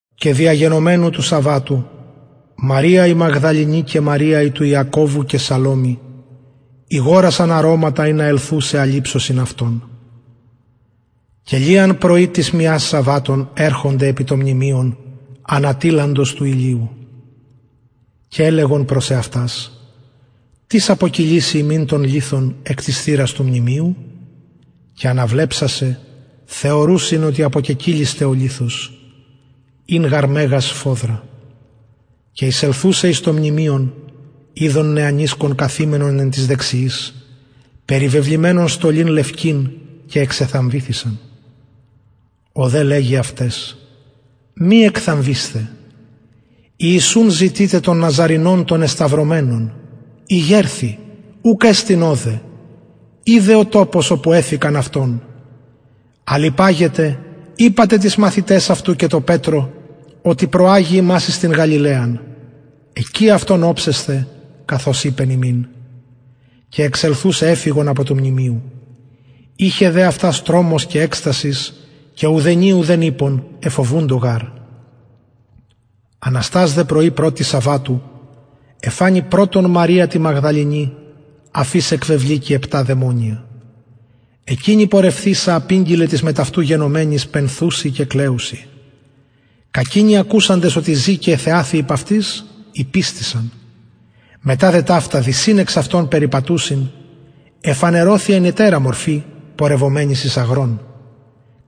και διαγενομενου του σαββατου μαρια η μαγδαληνη και μαρια ιακωβου και σαλωμη ηγορασαν αρωματα ινα ελθουσαι αλειψωσιν αυτον και λιαν πρωι της μιας σαββατων ερχονται επι το μνημειον ανατειλαντος του ηλιου και ελεγον προς εαυτας τις αποκυλισει ημιν τον λιθον εκ της θυρας του μνημειου και αναβλεψασαι θεωρουσιν οτι αποκεκυλισται ο λιθος ην γαρ μεγας σφοδρα και εισελθουσαι εις το μνημειον ειδον νεανισκον καθημενον εν τοις δεξιοις περιβεβλημενον στολην λευκην και εξεθαμβηθησαν ο δε λεγει αυταις μη εκθαμβεισθε ιησουν ζητειτε τον ναζαρηνον τον εσταυρωμενον ηγερθη ουκ εστιν ωδε ιδε ο τοπος οπου εθηκαν αυτον αλλ υπαγετε ειπατε τοις μαθηταις αυτου και τω πετρω οτι προαγει υμας εις την γαλιλαιαν εκει αυτον οψεσθε καθως ειπεν υμιν και εξελθουσαι εφυγον απο του μνημειου ειχεν δε αυτας τρομος και εκστασις και ουδενι ουδεν ειπον εφοβουντο γαρ αναστας δε πρωι πρωτη σαββατου εφανη πρωτον μαρια τη μαγδαληνη αφ ης εκβεβληκει επτα δαιμονια εκεινη πορευθεισα απηγγειλεν τοις μετ αυτου γενομενοις πενθουσιν και κλαιουσιν κακεινοι ακουσαντες οτι ζη και εθεαθη υπ αυτης ηπιστησαν μετα δε ταυτα δυσιν εξ αυτων περιπατουσιν εφανερωθη εν ετερα μορφη πορευομενοις εις αγρον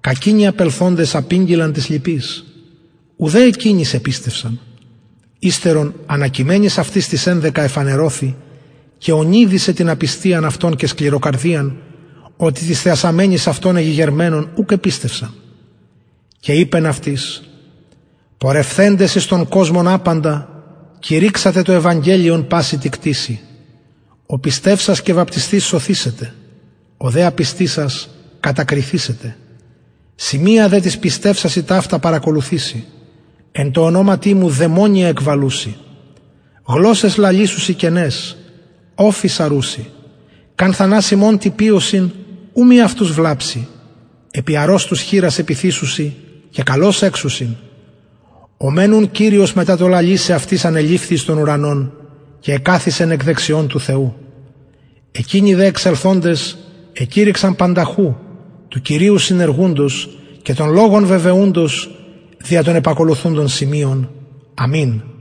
κακεινοι απελθοντες απηγγειλαν τοις λοιποις ουδε εκεινοις επιστευσαν υστερον ανακειμενοις αυτοις τοις ενδεκα εφανερωθη και ωνειδισεν την απιστιαν αυτων και σκληροκαρδιαν οτι τοις θεασαμενοις αυτον εγηγερμενον ουκ επιστευσαν και ειπεν αυτοις πορευθεντες εις τον κοσμον απαντα κηρυξατε το ευαγγελιον παση τη κτισει ο πιστευσας και βαπτισθεις σωθησεται ο δε απιστησας κατακριθησεται σημεια δε τοις πιστευσασιν ταυτα παρακολουθησει εν τω ονοματι μου δαιμονια εκβαλουσιν γλωσσαις λαλησουσιν καιναις οφεις αρουσιν καν θανασιμον τι πιωσιν ου μη αυτους βλαψη επι αρρωστους χειρας επιθησουσιν και καλως εξουσιν ο μεν ουν κυριος μετα το λαλησαι αυτοις ανεληφθη εις τον ουρανον και εκαθισεν εκ δεξιων του θεου εκεινοι δε εξελθοντες εκηρυξαν πανταχου του κυριου συνεργουντος και τον λογον βεβαιουντος δια των επακολουθουντων σημειων αμην